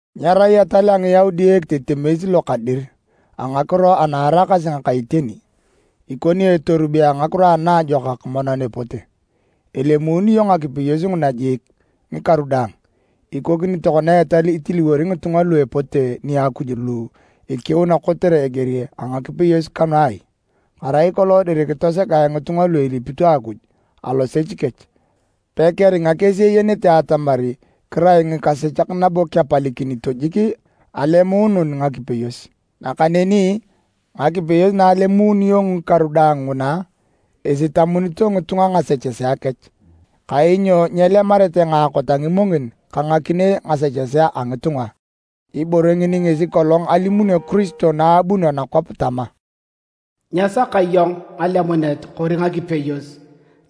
Nyerai etal a Ngiyaudi ekitetemes lo ka dir a ngakiro ana eraakasi ngaka iteni. Ikoni etorube a ngakiro anaajokak monan epote. Elemuununio ngakipeyos nguna jiik, ngikaru daang. Ikokini tokona etal itiliwori ngitunga lu epote nia Akuj lu ikiuna kotere eger a ngakipeyos kanu ai? Arai kolong dir kitosegae ngitunga lu elipito Akuj alosech kech, pakeringa kesi eyenete atamar kirai ngikasechak nabo kepalikinito jik alemuunun ngakipeyos. Nakaneni ngakipeyos na elemuununio ngikaru daang nguna, isitamunito ngitunga ngasechesea kech. Kainyo nyelemarete ngaakot a ngimongin ka ngakinei ngasechesea a ngitunga. Ibore ngini ngesi kolong alimunio Kiristo na abunio nakwap tama, “Nyesaka iyong ngalemunet kori ngakipeyos,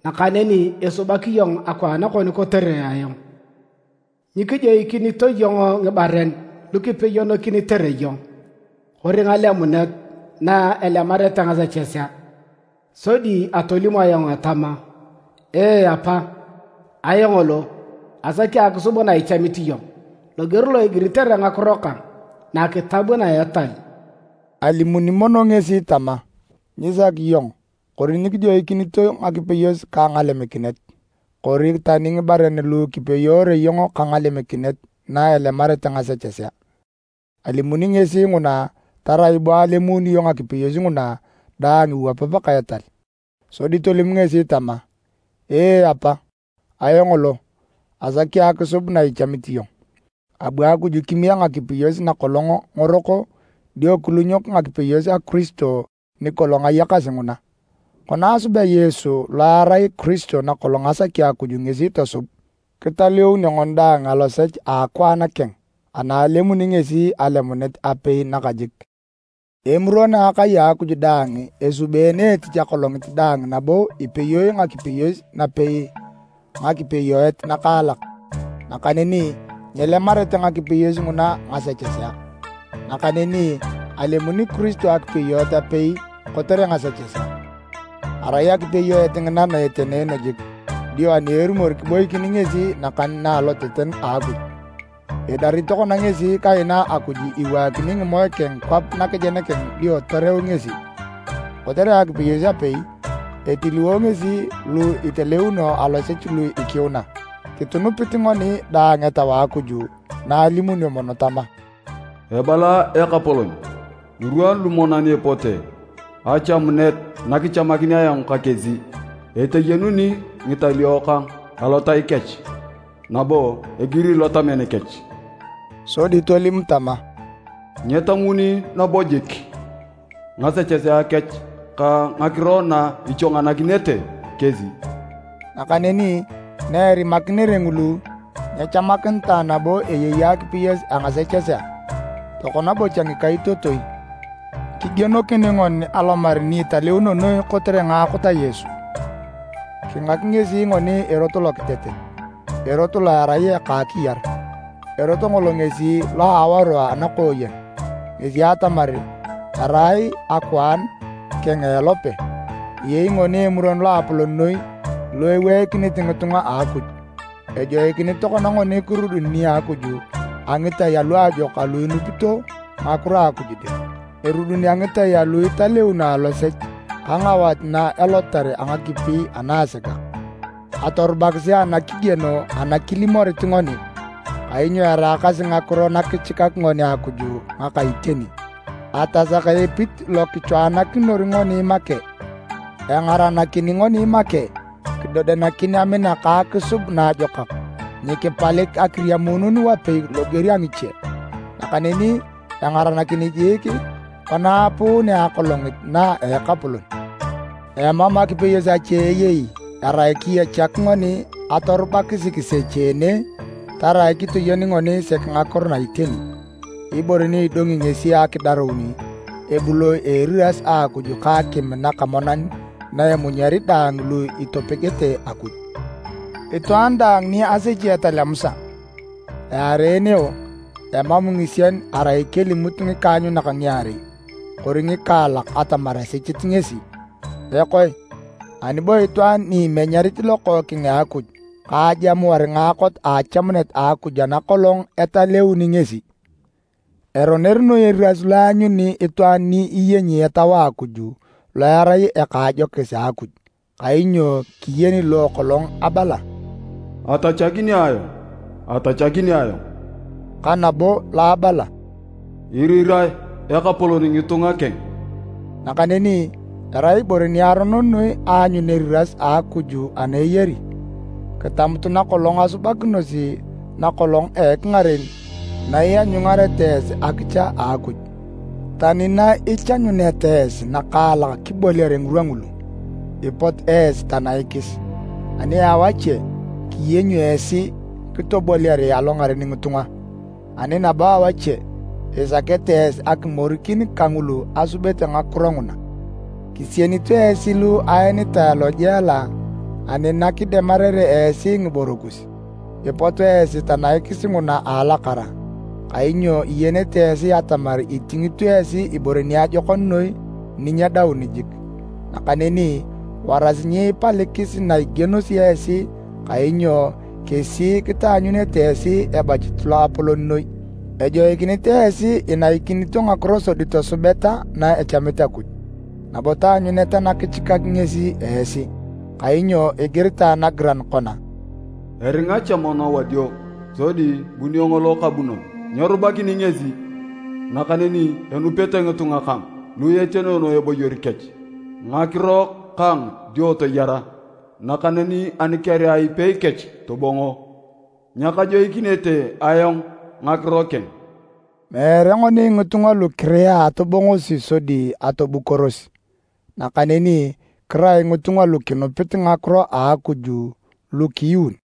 nakaneni isubak iyong akwaan kon kotere ayong. Nyikijoikinito iyong ngibaren lukipeyokinitere iyong, kori ngalemunet na elemarete ngasechesea. Sodi atolim ayong atama, ‘Ee Apa, ayong lo, asaki akisub na ichamit iyong, loger lo igiritere ngakiro kang, nakitab na a etal.’” Alimuni mono ngesi tama, “Nyisaki iyong kori nyikijoikinito ngakipeyos ka ngalemikinet, kori tani ngibaren lu kipeyoore iyong ka ngalemikinet na elemarete ngasechesea.” Alimuni ngesi nguna tarai bo alemuununio ngakipeyos nguna daang iwapap ka etal. Sodi tolim ngesi tama, “Ee Apa, ayong lo, asaki akisub na ichamit iyong.” Abu Akuj kimiek ngakipeyos na kolong ngorok dio kilunyok akipeyos a Kiristo ni kolong ayakasi nguna. Kona asubea Yesu lo erai Kiristo na kolong asaki Akuj ngesi tosub, kitaleunio ngoni daang alosech a akwaan keng ana alemuni ngesi alemunet apei nakajik. Emuron a akai a Akuj daang esubeene etich akolongit daang nabo ipeyoe ngakipeyos ngapei ngakipeyoet ngakaalak, nakaneni nyelemarete ngakipeyos nguna ngasechesea. Nakaneni alemuni Kiristo akipeyoet apei kotere ngasechesea. Arai akipeyoet ngina na etenoono jik dio ani erumor kiboikin ngesi nakan na aloteten a Akuj. Idarit tokona ngesi kaina Akuj iwaakini ngimoe keng kwap nakejen keng dio toreu ngesi. Kotere akipeyos apei, etiliwo ngesi lu etaleunio alosech lu ikiuna. Kitunupit ngoni dang Etau a Akuj na alimunio mono tama, “Ebala Ekapolon, ngirwa lu monan epote, achamunet nakichamakin ayong ka kesi. Eteyenuni ngitalio kang alotai kech, nabo egiri lotamen kech.” Sodi tolim tama, “Nyetamuni nabo jik ngasechesea kech ka ngakiro na ichwanganakinete kesi.” Nakaneni na erimakinere ngulu, nyechamakinitae nabo eyei akipeyos a ngasechesea. Tokona bocha ngikaitotoi, kigienokin ngoni alomar ni Italeuno Noi kotere ngaakot a Yesu. Kingak ngesi ngoni erot lokitetet, erot lo erai eka akiyar, erot ngolo ngesi lo a awaru anakooyen, ngesi atamar, erai akwaan keng a elope. Eyei ngoni Emuron Loapolon noi lo eweikinit ngitunga a Akuj. Ejoikinit tokona ngoni kirudun nia Akuj a ngitai aluajokak alu enupito ngakiro a Akuj dir. Erudun a ngitai alu etaleun alosech ka ngawat na elotar a ngakipi anaasegak. Atorubakisi anakigieno ana kilimorit ngoni, kainyo eraakasi ngakiro nakichikak ngoni Akuj ngaka iteni. Atasaka epit lo kichoanakinor ngoni make, engaranakin ngoni make kidodianakin amina ka akisub naajokak. Nyikipalik akiriamuunun wapei loger a ngiche. Nakaneni engaranakin jiik kona aapunea Akolongit na a Ekapolon. Emam akipeyos ache eyei erai kiyechak ngoni atorubakisi kisecheene tarai kitoyen ngoni sek ngakiro na iteni. Ibore ni idongi ngesi akidarun a ebuloi eriras a Akuj ka akim naka monan na emunyari daang lu itopegete Akuj! Itwaan daang ni asechi etal a Musa, aareeneo emam ngisien arai kelimut ngikaanyunak ngiarei kori ngikaalak atamar esechit ngesi. Ekoe, ani bo itwaan ni imenyarit Lokookeng a Akuj ka ajamuar ngaakot a achamunet a Akuj ana kolong etaleuni ngesi? Eroner noi eriras lo eanyuni itwaan ni iyenyi Etau a Akuj lo erai eka a ajokis a Akuj! Kainyo kiyeni lo kolong abala, “Atachakini ayong, atachakini ayong,” ka nabo lo abala, “Irirae Ekapolon ngitunga keng”. Nakaneni erai ibore niaronon noi aanyun eriras a Akuj ana eyari! Kitamutu na kolong asubakinosi na kolong a ekingaren na ianyungareta esi akicha a Akuj. Tani na ichanyuneta esi nakaalak kiboliare ngirwa ngulu, ipot esi tanaikis. Ani awache kiyenyio esi kitoboliare alongaren ngitunga, ani nabo awache isakete esi akimorikin kangulu asubere ngakiro nguna. Kisienito esi lu aenitae alojela ani nakidemarere esi ngiboro kus, ipot esi tanaikis nguna a alakara, kainyo iyenete esi atamar itingito esi ibore niajokon noi ni nyedaun jik. Nakaneni warasi nyiipalikis na igienosi esi kainyo kesi kitaanyunete esi ebachit loapolon noi. Ejoikinit esi inaikinito ngakiro sodi tosubeta na echamit Akuj, nabo taanyuneta nakichikak ngesi esi. Kainyo igiritae nagiran kona, “Eringa cha mono wadio, sodi bunio ngolo kabunon, nyerubakini ngesi. Nakaneni enupete ngitunga kang lu etenoono eboyor kech ngakiro kang dio toyara, nakaneni ani kerea ipei kech tobongo, nyakajoikinete ayong ngakiro keng.” Meere ngoni ngitunga lu kirea atobongosi sodi atobukoros, nakaneni kirai ngitunga lu kinupit ngakiro a Akuj lu kiyuun.